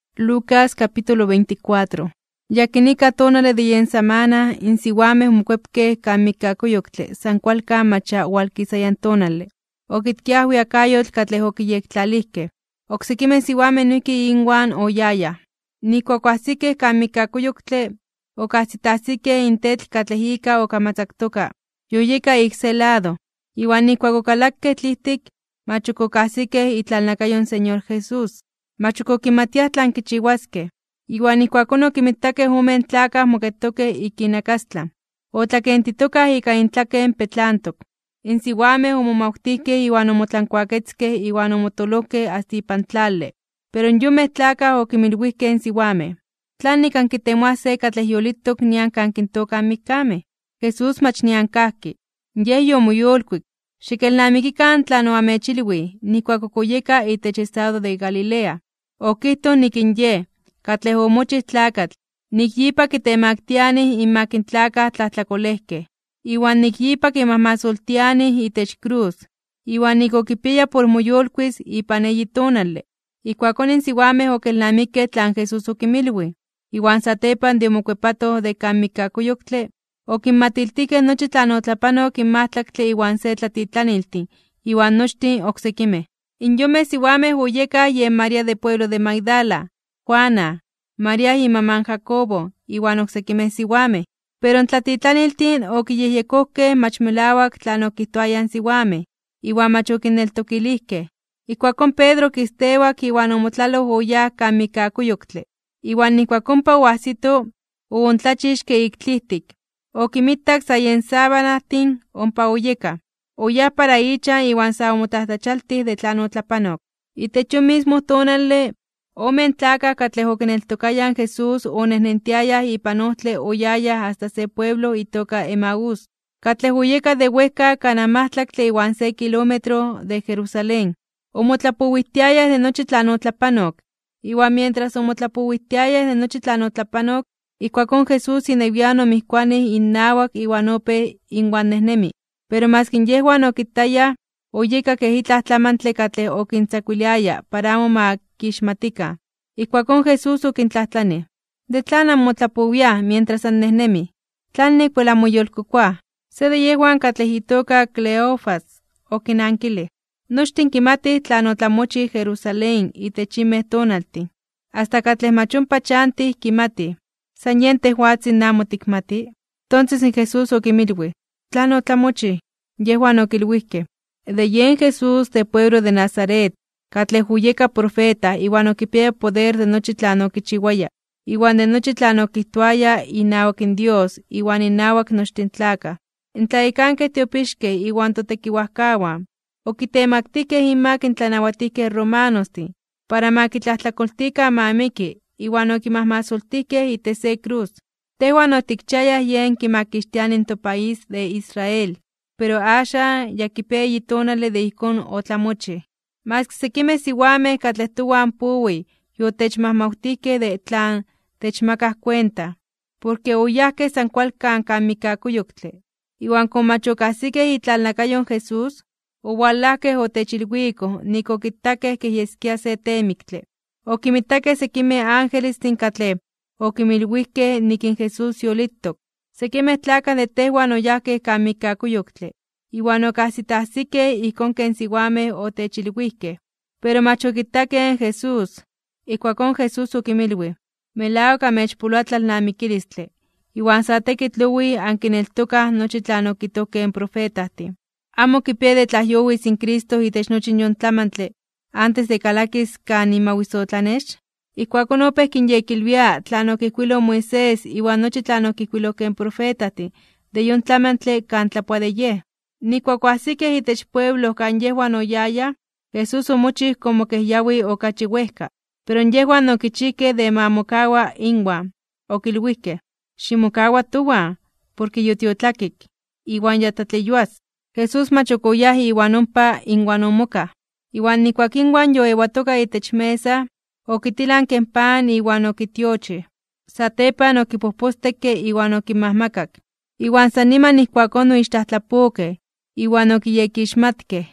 In yakinika tonale de yen samana, in siwamej omokuepkej kan mikkakuyoktle san kualkan mach ya owalkisaya in tonale, okitkiaj in ajwiakayotl katlej okiyektlalijkej. Oksekimej siwamej noijki inwan oyayaj. Nijkuak oajsikej kan mikkakuyoktle, okajsitajsikej in tetl katlej ika okamatzaktoka, yoyeka ik se lado. Iwan nijkuak okalakej tlijtik, mach okajsikej itlalnakayo in Señor Jesús. Mach ok okimatiaj tlan kichiwaskej, iwan ijkuakón okinmitakej omen tlakaj moketokej ik innakastlan, otlakentitokaj ika intlaken petlantok. In siwamej omomawtijkej iwan omotlankuaketzkej iwan omotoolojkej asta ipan tlale. Pero in yonmej tlakaj okinmilwijkej in siwamej: ―¿Tlanik ankitemoaj se katlej yolitok nian kan kintookaj in mikkamej? Jesús mach nian kajki. Yej yomoyolkuik. Xikelnamikikan tlan oamechilwij nijkuak ok oyeka itech estado de Galilea. Okijtoj nik in Yej, katlej omochij tlakatl, nik yipa kitemaktianij (kitemaktilianij) inmak in tlakaj tlajtlakolejkej, iwan nik yipa kimajmasoltianij itech krus, iwan nik okipiaya por moyolkuis (moyolitis) ipan eyi tonale. Ijkuakón in siwamej okelnamikej tlan Jesús okinmilwij. Iwan satepan de omokuepatoj de kan mikkakuyoktle, okinmatiltijkej nochi tlan otlapanok in majtlaktle iwan se tlatitlaniltin iwan nochtin oksekimej. In yonmej siwamej oyekaj yen María de pueblo de Magdala, Juana, María imaman Jacobo, iwan oksekimej siwamej. Pero in tlatitlaniltin okiyejyekojkej mach melawak tlan okijtoayaj in siwamej, iwan mach okinneltokilijkej. Ijkuakón Pedro okistewak iwan omotlaloj oyáj kan mikkakuyoktle. Iwan nijkuak ompa oajsito, oontlachixke ik tlijtik, okinmitak sa yen sabanajtin ompa oyekaj. Oyáj para ichan iwan sa omotlajtlachialtij (omomajmawtij) de tlan otlapanok. Itech yon mismo tonale, omen tlakaj katlej okineltokayaj in Jesús onejnentiayaj ipan ojtle oyayaj asta se pueblo itoka Emaús, katlej oyeka de wejka kanaj majtlaktle iwan se kilómetro de Jerusalén. Omotlapowijtiayaj de nochi tlan otlapanok. Iwan mientras omotlapowijtiayaj de nochi tlan otlapanok, ijkuakón Jesús inewian omijkuanij innawak iwan opéj inwan nejnemi. Pero maski yejwan okitayaj, oyeka kej itlaj tlamantle katlej okintzakuiliaya para amo ma kixmatikan. Ijkuakón Jesús okintlajtlanij: ―¿De tlan namotlapowiaj mientras annejnemij? ¿Tlanik wel anmoyolkokoaj? Se de yejwan katlej itoka Cleofas, okinankilij: ―Nochtin kimatij tlan otlamochij Jerusalén itech yinmej tonaltin. Asta katlej mach ompa chantij kimatij. ¿San yen tejwatzin in amo tikmati? Tonses in Jesús okinmilwij: ―¿Tlan otlamochij? Yejwan okilwijkej: ―De yen Jesús de pueblo de Nazaret, katlej oyeka profeta iwan okipiaya poder de nochi tlan okichiwaya, iwan de nochi tlan okijtoaya inawak Dios iwan innawak nochtin in tlakaj. In tlayekankej tiopixkej iwan totekiwajkawan, okitemaktijkej (okitemaktilijkej) inmak in tlanawatijkej romanostin, para ma kitlajtlakoltikan ma miki, iwan okimajmasoltijkej itech se krus. Tejwan otikchiayaj Yej kimakixtiani in topaís de Israel. Pero axan, ya kipia eyi tonale de ijkón otlamochij. Maski sekimej siwamej katlej towan powij yotechmajmawtijkej de tlan techmakaj kuenta, porke oyajkej san kualkan kan mikkakuyoktle, iwan komo mach okajsikej itlalnakayo in Jesús, owalajkej otechilwikoj nik okitakej kej yeskia se teemiktle, okinmitakej sekimej angelestin katlej okinmilwijkej nik in Jesús yolitok. Sekimej tlakaj de tejwan oyajkej kan mikkakuyoktle, iwan okajsitajsikej ijkón ken siwamej otechilwijkej, pero mach okitakej in Jesús. Ijkuakón Jesús okinmilwij: ―¡Melawak amechpoloa tlalnamikilistle, iwan sa tekitl owij ankineltokaj nochi tlan okijtojkej in profetajtin! ¿Amo okipiaya de tlajyowis in Cristo itech nochi in yon tlamantle, antes de kalakis kan imawisotlanex? Ijkuakón opéj kinyekilwia tlan okijkuiloj in Moisés iwan nochi tlan okijkuilojkej in profetajtin de yon tlamantle kan tlapoa de Yej. Nijkuak oajsikej itech pueblo kan yejwan oyayaj, Jesús omochij komo kej yawi okachi wejka. Pero yejwan okichijkej de ma mokawa inwan. Okilwijkej: ―Ximokawa towan, porke yotiotlakik, iwan ya tlatleyuas. Jesús mach ok oyáj iwan ompa inwan omokaj. Iwan nijkuak inwan yoewatoka itech mesa, okitilanke in pan iwan okitiochij. Satepan okipojpostekke iwan okinmajmakak. Iwan san niman ijkuakón oixtlajtlapokej, iwan okiyekixmatkej.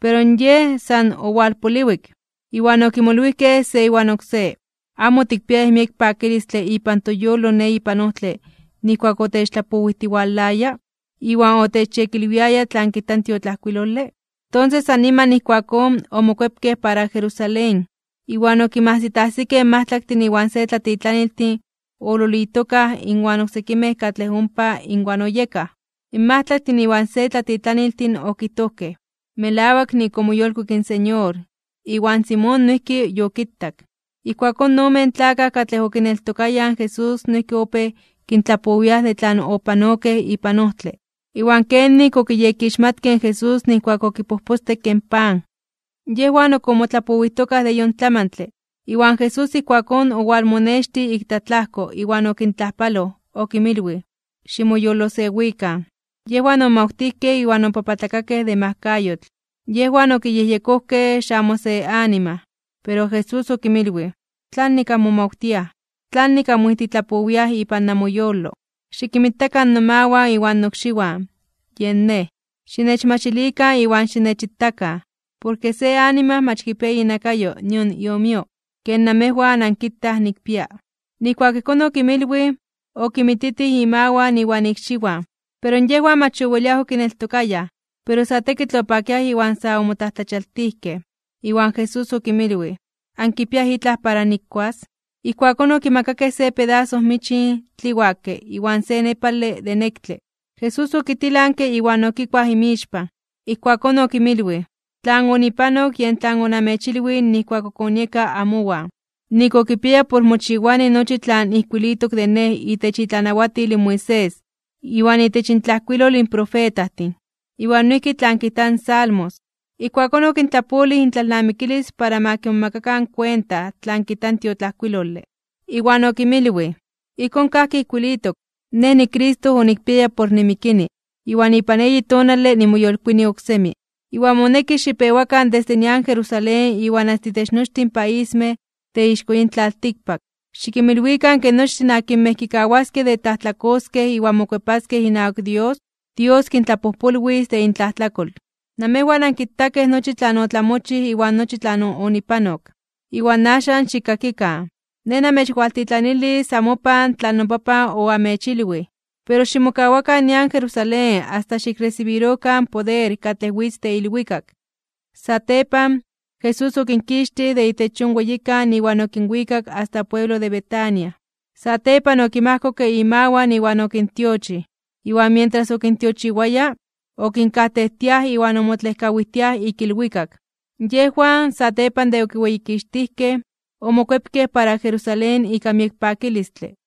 Pero Yej san owalpoliwik. Iwan okimolwijkej se iwan oksé: ―¿Amo otikpiayaj miek pakilistle ipan toyolo ne ipan ojtle nijkuak otechtlapowijtiwalaya, iwan otechyekilwiaya tlan kijta in tiotlajkuilole? Tonses san niman ijkuakón, omokuepkej para Jerusalén. Iwan okinmajsitajsikej in majtlaktin iwan se tlatitlaniltin oololitokaj inwan oksekimej katlej ompa inwan oyekaj. In majtlaktin iwan se tlatitlaniltin okijtojkej: ―Melawak nik omoyolkuik in Señor, iwan Simón noijki yokitak. Ijkuakón, in omen tlakaj katlej okineltokayaj in Jesús noijki opéj kintlapowiaj de tlan opanokej ipan ojtle, iwan kenik okiyekixmatkej in Jesús nijkuak okipojpostekke in pan. Yejwan ok omotlapowijtokaj de yon tlamantle, iwan Jesús ijkuakón owalmonextij ik tlatlajko iwan okintlajpaloj, okinmilwij: ―Ximoyolosewikan. Yejwan omomawtijkej iwan opapatlakakej (obibiokakej) de majkayotl. Yejwan okiyejyekojkej xamo se anima. Pero Jesús okinmilwij: ―¿Tlanik anmomawtiaj? ¿Tlanik anmoijtitlapowiaj ipan namoyolo? Xikinmitakan nomawan iwan nokxiwan. Yen Nej. Xinechmachilikan iwan xinechitakan. Porke se anima mach kipia inakayo nion iomio, ken namejwan ankitaj nikpia. Nijkuak ijkón okinmilwij, okinmititij imawan iwan ikxiwan. Pero yejwan mach oweliaj okineltokayaj, pero sa tekitl opakiaj iwan sa omotlajtlachialtijkej (omomajmawtijkej). Iwan Jesús okinmilwij: ―¿Ankipiaj itlaj para nikuas? Ijkuakón okimakakej se pedaso michin tliwakej iwan se nepale (tlanepale) de nektle. Jesús okitilanke (okitzkij) iwan okikuaj inmixpan. Ijkuakón okinmilwij: ―Tlan onipanok, yen tlan onamechilwij nijkuak ok onieka amowan: nik okipiaya por mochiwani nochi tlan ijkuilitok de Nej itech itlanawatil in Moisés, iwan itech intlajkuilol in profetajtin, iwan noijki tlan kijta in Salmos. Ijkuakón okintlapolij intlalnamikilis para ma kimomakakan kuenta tlan kijta in tiotlajkuilole. Iwan okinmilwij: ―Ijkón kajki ijkuilitok, Nej niCristo onikpiaya por nimikini, iwan ipan eyi tonale nimoyolkuini oksemi. Iwan moneki xipewakan desde nian Jerusalén iwan asta itech nochtin paismej de ixko yin tlaltikpak, xikinmilwikan ke nochtin akinmej kikawaskej de tlajtlakoskej iwan mokuepaskej inawak Dios, Dios kintlapojpolwis de intlajtlakol. Namejwan ankitakej nochi tlan otlamochij iwan nochi tlan onipanok. Iwan axan xikkakikan, Nej namechwaltitlanilis amopan tlan noPapan oamechilwij. Pero ximokawakan nian Jerusalén asta xikresibirokan in poder katlej witz de ilwikak. Satepan, Jesús okinkixtij de itech yon weyikan iwan okinwikak asta pueblo de Betania. Satepan okinmajkokke imawan iwan okintiochij. Iwan mientras okintiochiwaya, okinkajtejtiaj iwan omotlejkawijtiaj (otlejkok) ik ilwikak. Yejwan, satepan de okiweyikixtijkej, omokuepkej para Jerusalén ika miek pakilistle.